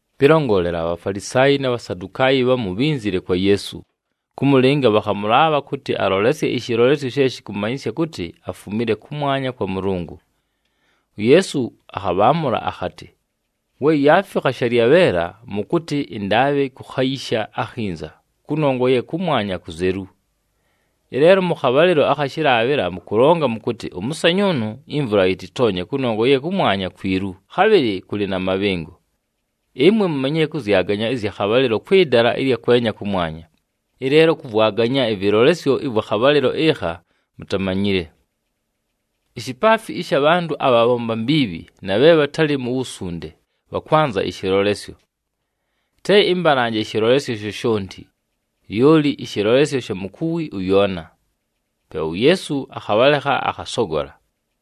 Pɨlongolela, aBhafalisaayi na Bhasadukaayi bhamu bhínzile kwa Yeesu, kʉmʉlɨnga bhakhamʉlaabha kʉtɨ alolesye ɨshɨlolesyo she shɨkʉmanyɨsya kʉtɨ afumile kʉmwanya kwa Mʉlʉngʉ. UYeesu akhabhaamʉla akhatɨ, “[We yaafikha shalyabheela, mʉkʉtɨ, ‘Ɨndaabhɨ kukhayisha akhinza kʉnongwa ye kʉmwanya kuzelu.’ Ɨleelo mʉ khabhalɨlo akha shɨlaabhɨla mʉkʉlonga mʉkʉtɨ, ‘Ʉmʉsanyʉʉnʉ imvula yɨtɨtoonye kʉnongwa ye kʉmwanya kwilu, khabhɨlɨ kʉlɨ na mabhɨngo.’ Ɨmwe mumanyile kʉzyaganya ɨzya khabhalɨlo kwɨ dala ɨlya kwenya kʉmwanya, ɨleelo kʉvwaganya ɨvɨlolesyo ɨvwa khabhalɨlo ɨkha mutamanyile.] Ishipaafi ɨsha bhantʉ abhabhomba mbiibhi na bhe bhatalɨ nu wusunde bhakwanza ɨshɨlolesyo. Te ɨmbalanje ɨshɨlolesyo shoshonti, lyoli ɨshɨlolesyo sha mukuwi ʉYoona.” Pe uYeesu akhabhalekha, akhasogola.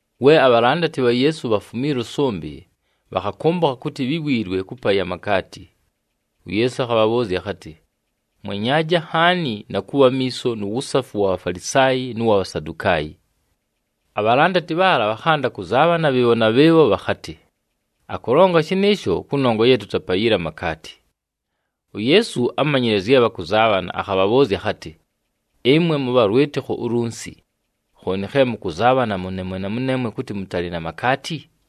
We abhalandati bha Yeesu bhafumiila ʉsʉmbɨ, bhakhakʉmbʉkha kʉtɨ bhíwiilwe kʉpaya amakaati. UYeesu akhabhabhʉʉzya akhatɨ, “Mwenyaaje nhaani, na kʉbha amiiso nu wusafu wa Bhafalisaayi nʉ wa Bhasadukaayi.” Abhalandati bhaala bhakhanda kʉzaabhana bhɨɨbho na bhɨɨbho bhakhatɨ, “Akʉlonga shɨnɨɨsho kʉnongwa ye tutapayile amakaati.” UYeesu ámanyile zye bhakʉzaabhana, akhabhabhʉʉzya akhatɨ, “Ɨmwe mʉbha lwɨtɨkho ulunsi! Khooni khe mʉkʉzaabhana mʉneemwe na mʉneemwe kʉtɨ mʉtalɨ na makaati?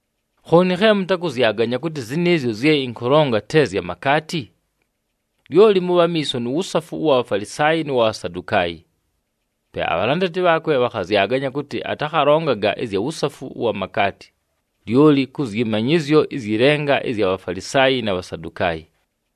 Khooni khe mʉtakʉzyaganya kʉtɨ zɨnɨɨzyo zye ɨnkʉlonga te zya makaati? Lyoli mʉbhe amiiso nu wusafu ʉwa Bhafalisaayi nʉ wa Bhasadukaayi.” Pe abhalandati bhaakwe bhakhazyaganya kʉtɨ atakhalongaga ɨzya wusafu ʉwa makaati, lyoli kʉ zyɨ manyɨzyo ɨzyɨ lenga ɨzya Bhafalisaayi na Bhasadukaayi.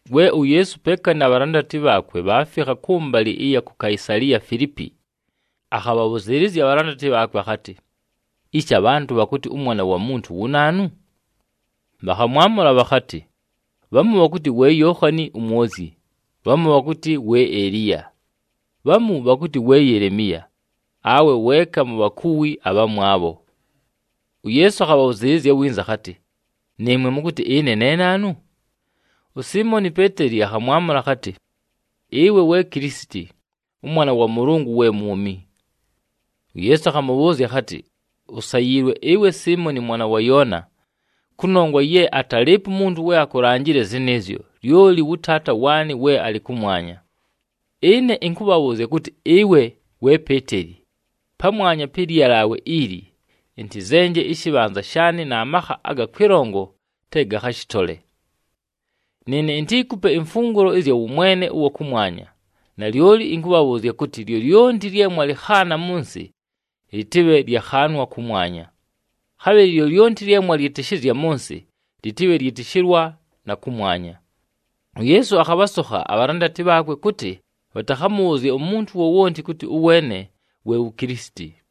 We uYeesu peeka na bhalandati bhaakwe bhaafikha kʉmbalɨ ɨya ku Kaisaliya Filiipi, akhabhabhʉzɨɨlɨzya abhalandati bhaakwe akhatɨ, “Ishi abhantʉ bhakʉtɨ ʉMwana wa Muntu wu naanu?” Bhakhamwamʉla bhakhatɨ, “Bhamu bhakʉtɨ we Yookhani uMwozyi, bhamu bhakʉtɨ we Eliya, bhamu bhakʉtɨ we Yelemiya awe weeka mu bhakuwi abhamwabho.” UYeesu akhabhʉzɨɨlɨzya winza akhatɨ, “Nɨɨmwe, mʉkʉtɨ ɨne ne naanu?” USiimoni Peeteli akhamwamʉla akhatɨ, “Ɨwe we Kilisiti, ʉMwana wa Mʉlʉngʉ we mwumi.” UYeesu akhamʉbhʉʉzya akhatɨ, “Usayiilwe ɨwe Siimoni mwana wa Yoona, kʉnongwa ye atalɨɨpo umuntu we akulanjile zɨnɨɨzyo, lyoli wʉ Taata waanɨ we alɨ kʉmwanya. Ɨne ɨnkʉkʉbhʉʉzya kʉtɨ ɨwe, we Peeteli, pamwanya pɨ lyalaawe ili, ɨntɨzenje ɨshɨbhanza shaanɨ na makha aga kwɨlongo te gakhashɨtole. Nɨɨne intiikupe imfungulo ɨzya wʉmwene ʉwa kʉmwanya, nalyoli ɨnkʉbhabhʉʉzya kʉtɨ, lyolyonti lye mwalɨkhaana mʉ nsɨ, lɨtɨbhe lyakhaanwa kʉmwanya. Khabhɨlɨ lyolyonti lye mwalyɨtɨshɨzya mʉ nsɨ, lɨtɨbhe lyɨtɨshɨlwa na kʉmwanya.” UYeesu akhabhasokha abhalandati bhaakwe kʉtɨ bhatakhamʉbhʉʉzye umuntu wowonti kʉtɨ ʉweene we wu Kilisiti.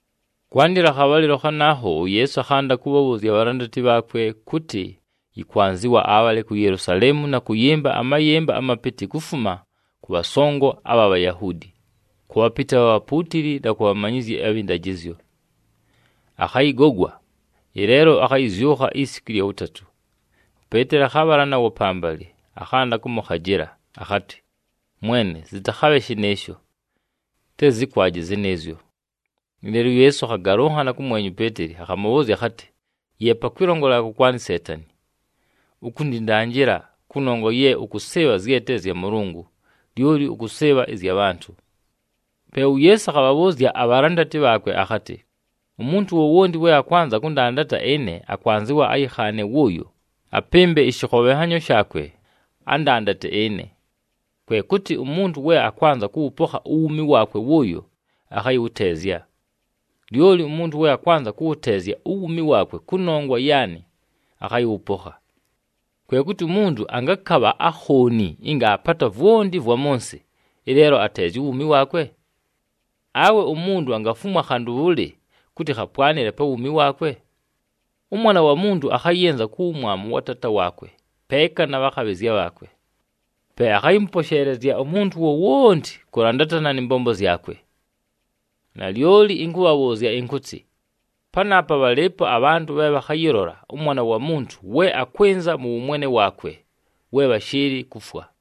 Kwandɨla akhabhalɨlo khanaakho, uYeesu akhanda kʉbhabhʉʉzya abhalandati bhaakwe kʉtɨ yɨkwanzɨwa abhale ku Yelusaleemu na kʉyɨmba amayɨmba amapɨtɨ kufuma kʉ bhasongo abha Bhayahuudi, kʉ bhapɨtɨ abha bhapuutili na ku bhamanyizyi abhɨ ndajɨzyo. Akhayɨgogwa, ɨleelo akhayɨzyʉkha isiku ɨlya wʉtatʉ. UPeeteli akhabhala nawo pambalɨ, akhanda kʉmʉkhajɨla, akhatɨ, “Mwene zɨtakhabhe shɨnɨɨsho! Te zɨkwaje zɨnɨɨzyo!” Ɨleelo uYeesu akhagalʉnhana kʉmwenya uPeeteli, akhamʉbhʉʉzya akhatɨ, “Yeepa kwɨlongolela kʉkwanɨ Seetani! Ukundindanjila, kʉnongwa ye ʉkʉsɨɨbha zye te zya Mʉlʉngʉ, lyoli ʉkʉsɨɨbha ɨzya bhantʉ.” Pe uYeesu akhabhabhʉʉzya abhalandati bhaakwe akhatɨ, “Umuntu wowonti we akwanza kʉndandata ɨne, akwanzɨwa ayɨkhaane wʉʉyo, apɨmbe ɨshɨkhobhenhanyo shaakwe, andandate ɨne. Kwe kʉtɨ umuntu we akwanza kʉwʉpokha uwuumi waakwe wʉʉyo, akhayɨwʉteezya. Lyoli umuntu we akwanza kʉwʉteezya uwuumi waakwe kʉnongwa yaanɨ, akhayɨwʉpokha. Kwe kʉtɨ umuntu angakabha akhooni ɨnga aapata vwonti ɨvwa mʉ nsɨ, ɨleelo ateezya uwuumi waakwe? Awe umuntu angafumwa khantʉ bhʉlɨ kʉtɨ khapwanɨle pa wuumi waakwe? ɄMwana wa Muntu akhayɨnza ku wumwamu wa Taata waakwe peeka na bhakhabhɨzya bhaakwe. Pe akhayɨmʉposheelezya umuntu wowonti kʉlandatana nɨ mbombo zyakwe. Nalyoli ɨnkʉbhabhʉʉzya ɨnkʉtɨ, panaapa bhalɨɨpo abhantʉ bhe bhakhayɨlola ʉMwana wa Muntu we akwɨnza mʉ wʉmwene waakwe, we bhashɨɨlɨ kufwa.”